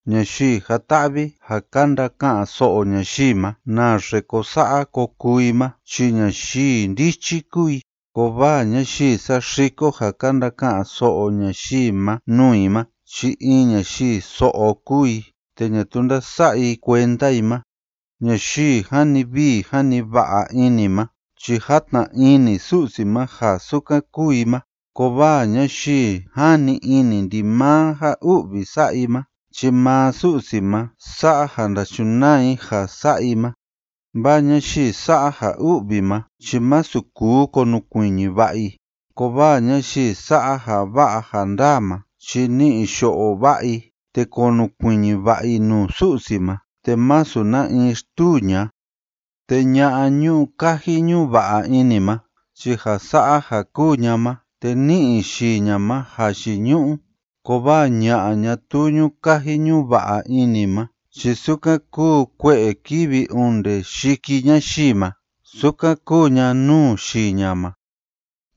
Ñayii jan‑ta'vi ja ka ndaka'an so'o ñayii ma naxe ko sa'a ko kuu i ma chi ñayii ndichi kúu i, kovaa ñayii saxiko ja ka ndaka'an so'o ñayii ma nuu i ma chi in ñayii so'o kúu i te ñatuu ndása'a i kuenda i ma. Ñayii jani vii jani va'a ini ma chi játna ini Su'si ma ja sukan kúu i ma, kovaa ñayii jani ini ndimaa ja u'vi sa'a i ma chi maa Su'si ma sa'a ja ndachunaa i ja sa'a i ma. Vaa ñayii sa'a ja u'vi ma chi masu kuu konukuiñi va'a i, kovaa ñayii sa'a ja va'a ja ndaa ma chi ni'i yo'o va'a i te konukuiñi va'a i nuu Su'si ma te masu na in xtuu ña'a. Te ña'a ñu'u kaji ñu'u va'a ini ma chi ja sa'a ja kúu ña ma te ní'i yii ña ma jayiñu'u, kovaa ña'a ñatuu ñu'u kaji ñu'u va'a ini ma chi sukan kúu kue'e kívi onde yiki ñayii ma sukan kúu ña nuu yii ña ma.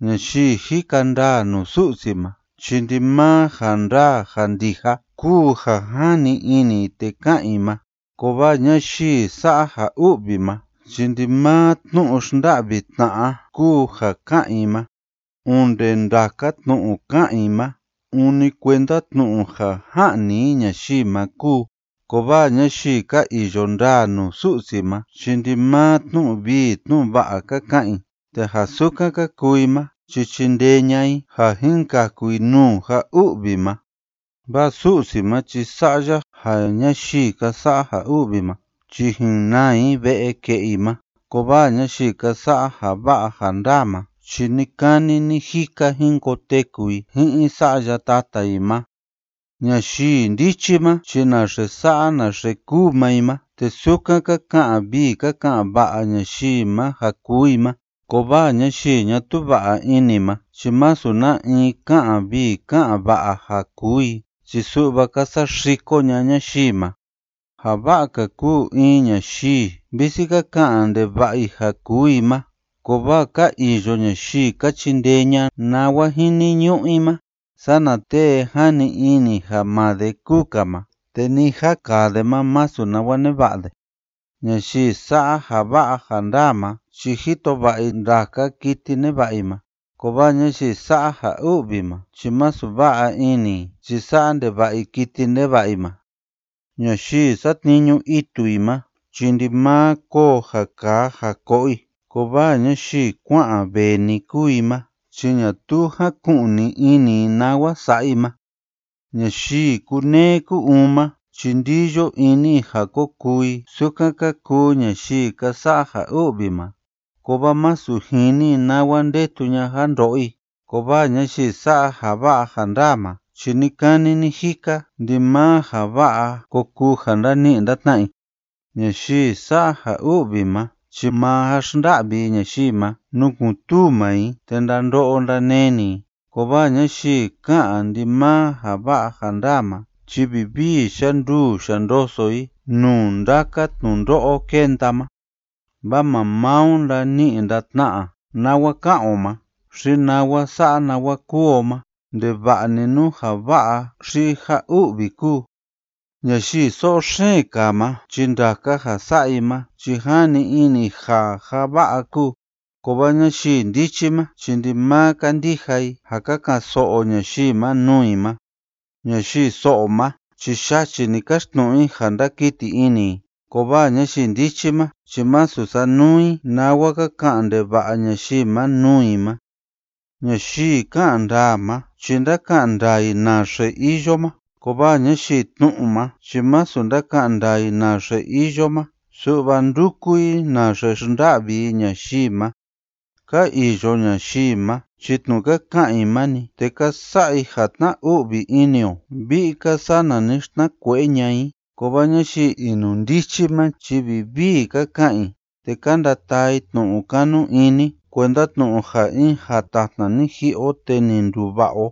Ñayii jika ndaa nuu Su'si ma chi ndimaa ja ndaa ja ndija kúu ja jani ini i te ká'an i ma, kovaa ñayii sa'a ja u'vi ma chi ndimaa tnu'u xnda'vi tna'a kúu ja ká'an i ma. Onde ndaka tnu'u ká'an i ma, ûni kuenda tnu'u ja ja'ni i ñayii ma kúu, kovaa ñayii ka iyo ndaa nuu Su'si ma chi ndimaa tnu'u vii tnu'u va'a ka ka'an i, te ja sukan ka kuu i ma chi chindee ña'a i ja jin kaku i nuu ja u'vi ma. Vaa Su'si ma chi sa'a ya ja ñayii ka sa'a ja u'vi ma chi jin naa i ve'e ke'e i ma, kovaa ñayii ka sa'a ja va'a ja ndaa ma chi ni‑kani ni‑jika jin koteku i ji'in sa'ya tata i ma. Ñayii ndichi ma chi naxe sa'a naxe kúu maa i ma, te sukan ka ka'an vii ka ka'an va'a ñayii ma ja kuu i ma, kovaa ñayii ñatuu va'a ini ma chi masu na in ká'an vii ká'an va'a ja kuu i chi su'va ka saxiko ña'a ñayii ma. Ja va'a‑ka kúu in ñayii visi ka ka'an ndeva'a i ja kuu i ma kovaa ka iyo ñayii ka chindee ña'a nawa jiniñu'u i ma, sana tee jani ini ja maa de kúu‑ka ma te ni ja kaa de ma masu nawa neva'a de. Ñayii sa'a ja va'a ja ndaa ma chi jito va'a i ndaka kiti neva'a i ma, kovaa ñayii sa'a ja u'vi ma chi masu va'a ini i chi sa'a ndeva'a i kiti neva'a i ma. Ñayii satniñu itu i ma chi ndimaa koo ja kaa ja ko'o i, kovaa ñayii kua'an vee‑ni kúu i ma chi ñatuu jáku'ni ini i nawa sa'a i ma. Ñayii kúneé kú‑uun ma chi ndíyo ini i ja ko kuu i sukan ka kuu ñayii ka sa'a ja u'vi ma, kovaa masu jini i nawa ndetu ña'a ja ndo'o i, kovaa ñayii sa'a ja va'a ja ndaa ma chi ni‑kani ni‑jika ndimaa ja va'a ko kuu ja ndani'i ndatna'a i. Ñayii sa'a ja u'vi ma chi maa ja xnda'vi i ñayii ma nukun‑tuu maa i te ndando'o ndaneni i, kovaa ñayii ká'an ndimaa ja va'a ja ndaa ma chi vivii yanduu yandoso i nuu ndaka tnundo'o kenda ma. Vaa maa maa o ndani'i ndatna'a nawa ká'an o ma xi nawa sa'a nawa kúu o ma ndeva'a‑ni nú ja va'a xi ja u'vi kúu. Ñayii so'o xeen kaa ma chi ndaka ja sa'a i ma chi jani ini i ja ja va'a kúu, kovaa ñayii ndichi ma chi ndimaa kándija i ja ka ka'an so'o ñayii ma nuu i ma. Ñayii so'o ma chi yachi‑ni káxtnu'u i ja ndákiti ini i, kovaa ñayii ndichi ma chi masu sánuu i nawa ka ka'an ndeva'a ñayii ma nuu i ma. Ñayii ká'an ndaa ma chi ndáka'an ndaa i naxe iyo ma, kovaa ñayii tnu'u ma chi masu ndáka'an ndaa i naxe iyo ma su'va ndúku i naxe xnda'vi i ñayii ma. Ka iyo ñayii ma chi tnu'u ka ka'an i ma‑ni, te ka sa'a i ja tna‑u'vi ini o vi'i‑ka sana ni xtnakue'e ña'a i, kovaa ñayii inundichi ma chi vivii ka ka'an i te ka ndataa i tnu'u kanu ini kuenda tnu'u ja in jatatna ni ji'i o te ni nduva'a o.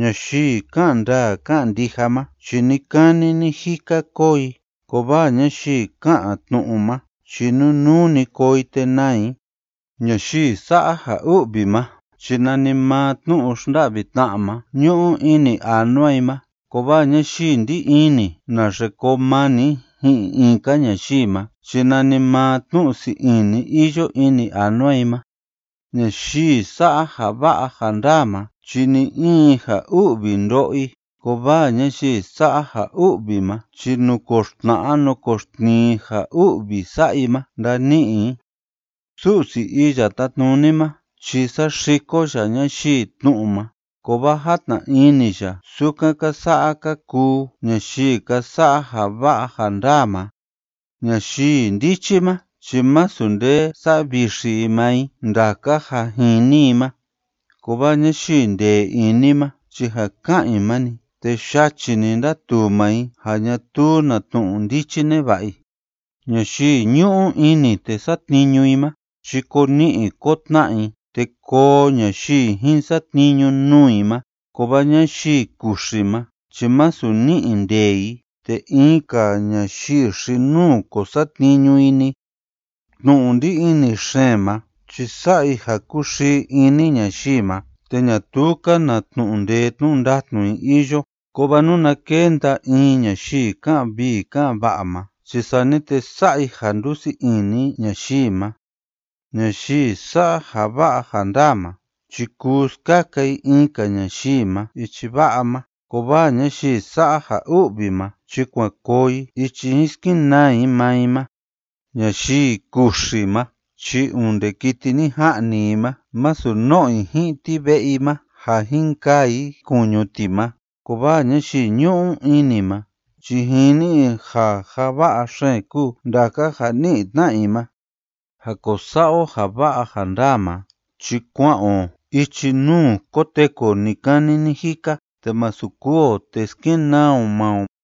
Ñayii ká'an ndaa ká'an ndija ma chi ni‑kani ni‑jika koo i, kovaa ñayii ká'an tnu'u ma chi nunuu‑ni koo i te naa i. Ñayii sa'a ja u'vi ma chi nanimaa tnu'u xnda'vi tna'a ma ñu'u ini anua i ma, kovaa ñayii ndí ini naxe koo mani i ji'in in‑ka ñayii ma chi nanimaa tnu'u sii ini iyo ini anua i ma. Ñayii sa'a ja va'a ja ndaa ma chi ni‑in ja u'vi ndo'o i, kovaa ñayii sa'a ja u'vi ma chi nukoxtna'a nukoxtnii ja u'vi sa'a i ma ndani'i i. Su'si Iya Tátnuni ma chi saxiko ya ñayii tnu'u ma, kovaa játna ini ya sukan ka sa'a ka kuu ñayii ka sa'a ja va'a ja ndaa ma. Ñayii ndichi ma chi masu nde savixi i maa i ndaka ja jini i ma, kovaa ñayii ndee ini ma chi ja ká'an i ma‑ni, te yachi‑ni ndatuu maa i ja ñatuu na tnu'u ndichi neva'a i. Ñayii ñu'u ini te satniñu i ma chi ko ni'i ko tna'a i te koo ñayii jin satniñu nuu i ma, kovaa ñayii kuxi ma chi masu ni'i nde i te in‑ka ñayii xi‑nuu ko satniñu i‑ni. Tnu'u ndí ini xeen ma chi sa'a i ja kúxii ini ñayii ma te ñatuu‑ka na tnu'u ndee tnu'u ndatnu i iyo, kovaa nuna kenda in ñayii ká'an vii ká'an va'a ma chi sani te sa'a i ja ndúsii ini ñayii ma. Ñayii sa'a ja va'a ja ndaa ma chi kuu skaka i in‑ka ñayii ma ichi va'a ma, kovaa ñayii sa'a ja u'vi ma chi kuan koo i ichi jin skenaa i maa i ma. Ñayii kuxi ma chi onde kiti ni ja'ni i ma masu no'o i ji'in ti ve'e i ma ja jin kaa i kuñu ti ma, kovaa ñayii ñu'u ini ma chi jini i ja ja va'a xeen kúu ndaka ja ni'i tna'a i ma. Ja ko sa'a o ja va'a ja ndaa ma chi kua'an o ichi nuu koteku o ni‑kani ni‑jika, te masu kûu o te skenaa o maa o.